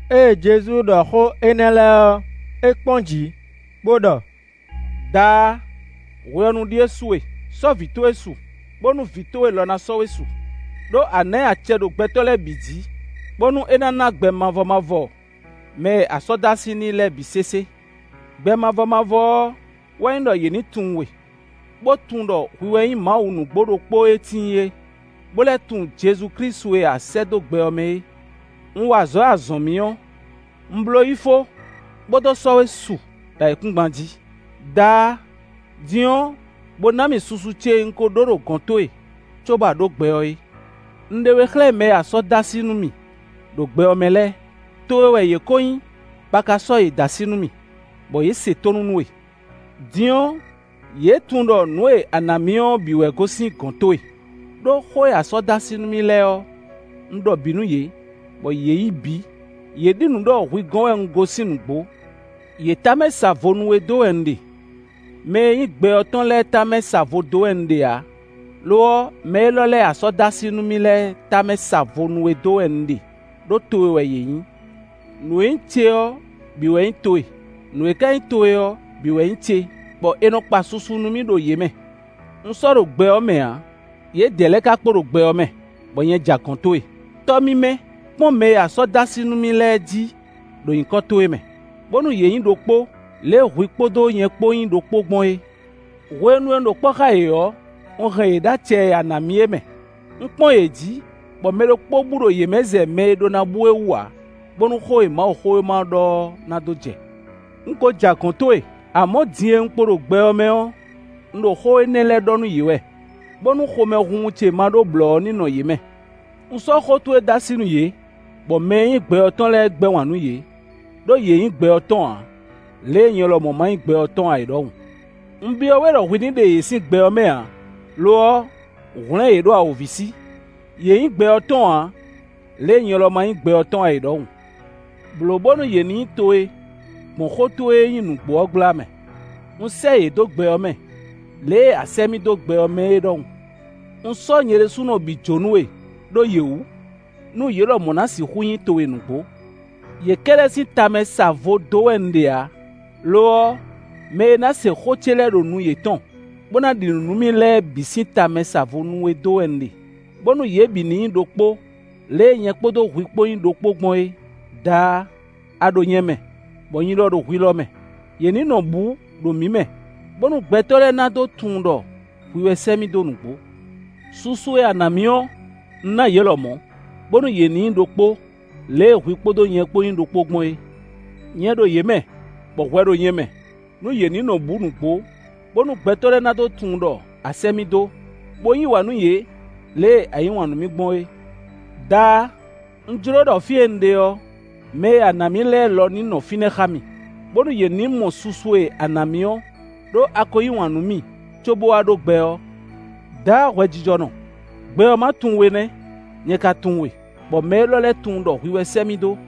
Ée Jezu ɖɔ xó énɛ́ lɛ́ɛ ɔ́, é kpɔ́n jǐ, bó ɖɔ: “Daá, hwe ɔ́ nu ɖíe su e; sɔ́ Vǐ towe su, bónú Vǐ towe lɔ ná sɔ́ we su. Đó a nǎ ɛ acɛ ɖo gbɛtɔ́ lɛ́ɛ bǐ jí, bónú é ná ná gbɛ mavɔ mavɔ mɛ e a sɔ́ dó así n'i lɛ́ɛ bǐ sésé. Gbɛ mavɔ mavɔ ɔ́ wɛ nyí ɖɔ yě ní tunwun we, bó tunwun ɖɔ hwi wɛ nyí Mawu nǔgbó ɖokpó e tíin é, bó lɛ́ tunwun Jezu Klísu e a sɛ́ dó gbɛ ɔ́ mɛ é. Un wa azɔ̌ e a zɔ̌n mì ɔ́, un bló yi fó, bó dó sɔ́ we su ɖo ayǐkúngban jí. Daá! Din ɔ́, bo ná mì susu ce e un ko ɖó ɖo gɔ̌n towe, cóbɔ a ɖǒ gbɛ ɔ́ é. “Un ɖe we xlɛ́ mɛ e a sɔ́ dó así nú mì ɖo gbɛ ɔ́ mɛ lɛ́ɛ. Towe wɛ yě ko nyí, bɔ a ka sɔ́ yě dó así nú mì, bɔ yě se tónú nú we. Din ɔ́, yě tunwun ɖɔ nǔ e a nǎ mì ɔ́ bǐ wɛ gosín gɔ̌n towe, ɖó xó e a sɔ́ dó así nú mì lɛ́ɛ ɔ́, un ɖɔ bǐ nú yě, bɔ yě yí bǐ; yě ɖi nǔ ɖɔ hwi gɔ́n wɛ un gosín nǔgbó. “Yě tamɛ sa vo nú we dó wɛ un ɖe. Mɛ e nyí gbɛ ɔ́ tɔn lɛ́ɛ tamɛ sa vo dó wɛ un ɖe ǎ; lo ɔ́, mɛ élɔ́ lɛ́ɛ e a sɔ́ dó así nú mi lɛ́ɛ tamɛ sa vo nú we dó wɛ un ɖe, ɖó towe wɛ yě nyí. Nǔ e nyí ce ɔ́ bǐ wɛ nyí towe; nǔ e ka nyí towe ɔ́ bǐ wɛ nyí ce, bɔ è nɔ kpa susu nú mì ɖo yě mɛ. Un sɔ́ ɖo gbɛ ɔ́ mɛ ǎ, yědɛɛ lɛ́ɛ ka kpo ɖo gbɛ ɔ́ mɛ, bɔ nyɛ ja gɔ̌n towe. Tɔ́ mímɛ́! Kpɔ́n mɛ e a sɔ́ dó así nú mì lɛ́ɛ jí ɖo nyǐkɔ towe mɛ, bónú yě nyí ɖokpó, lě e hwi kpódó nyɛ kpó nyí ɖokpó gbɔn é. Hwenu e un ɖo kpɔ́ xá yě ɔ́, un hɛn yě ɖo acɛ e a nǎ mì é mɛ; un kpɔ́n yě jí, bɔ mɛ ɖokpó bú ɖo yě mɛ zɛ mɛ e ɖó ná bú é wú ǎ, bónú xó e Mawuxówéma ɔ́ ɖɔ ɔ́ ná dó jɛ. Un ko ja gɔ̌n towe; amɔ̌ din e un kpo ɖo gbɛ ɔ́ mɛ ɔ́, un ɖɔ xó énɛ́ lɛ́ɛ nú yě, bónú xomɛhunhun ce ma ɖó blɔ̌ ɔ́ ní nɔ yě mɛ. Un sɔ́ xó towe dó así nú yě, bɔ mɛ e nyí gbɛ ɔ́ tɔn lɛ́ɛ gbɛ́ wǎn nú yě, ɖó yě nyí gbɛ ɔ́ tɔn ǎ, lě e nyɛ lɔmɔ̌ ma nyí gbɛ ɔ́ tɔn ǎ é ɖɔhun. Un byɔ́ we ɖɔ hwi ní ɖe yě sín gbɛ ɔ́ mɛ ǎ; lo ɔ́, hwlɛ̌n yě ɖo awǒvi sí. Yě nyí gbɛ ɔ́ tɔn ǎ, lě e nyɛ lɔ ma nyí gbɛ ɔ́ tɔn ǎ é ɖɔhun. Blǒ bónú yě ní nyí towe gbɔn xó towe e nyí nǔgbó ɔ́ gbla mɛ. Un sɛ́ yě dó gbɛ ɔ́ mɛ, lě e a sɛ́ mì dó gbɛ ɔ́ mɛ é ɖɔhun. Un sɔ́ nyɛ ɖésú bǐ jǒ nú we ɖó yě wú, nú yě lɔmɔ̌ ná sixú nyí towe nǔgbó. “Yě kɛ́ɖɛ́ sín tamɛ sa vo dó wɛ un ɖe ǎ; lo ɔ́, mɛ e ná se xó ce lɛ́ɛ ɖo nu yětɔn, bó ná ɖi nǔ nú mì lɛ́ɛ bǐ sín tamɛ sa vo nú we dó wɛ un ɖe; bónú yě bǐ ní nyí ɖokpó, lě e nyɛ kpódó hwi kpó nyí ɖokpó gbɔn é. Daá, a ɖo nyɛ mɛ, bɔ nyí lɔ ɖo hwi lɔ mɛ; yě ní nɔ bǔ ɖo mǐ mɛ, bónú gbɛtɔ́ lɛ́ɛ ná dó tunwun ɖɔ hwi wɛ sɛ́ mì dó nǔgbó. Susu e a ná mì ɔ́, un ná yě lɔmɔ̌, bónú yě ní nyí ɖokpó, lě e hwi kpódó nyɛ kpó nyí ɖokpó gbɔn é. Nyɛ ɖo yě mɛ, bɔ hwɛ ɖo nyɛ mɛ, nú yě ní nɔ bǔ nǔgbó, bónú gbɛtɔ́ lɛ́ɛ ná dó tunwun ɖɔ a sɛ́ mì dó, bó yí wǎn nú yě, lě e a yí wǎn nú mì gbɔn é. “Daá! Un jló ɖɔ fí e un ɖe ɔ́, mɛ e a nǎ mì lɛ́ɛ lɔ ní nɔ fínɛ́ xá mì, bónú yě ní mɔ susu e a nǎ mì ɔ́, ɖó a ko yí wǎn nú mì cóbó wá ɖó gbɛ ɔ́. Daá hwɛjijɔnɔ! Gbɛ ɔ́ ma tunwun we nɛ́! Nyɛ ka tunwun we, bɔ mɛ élɔ́ lɛ́ɛ tunwun ɖɔ hwi wɛ sɛ́ mì dó.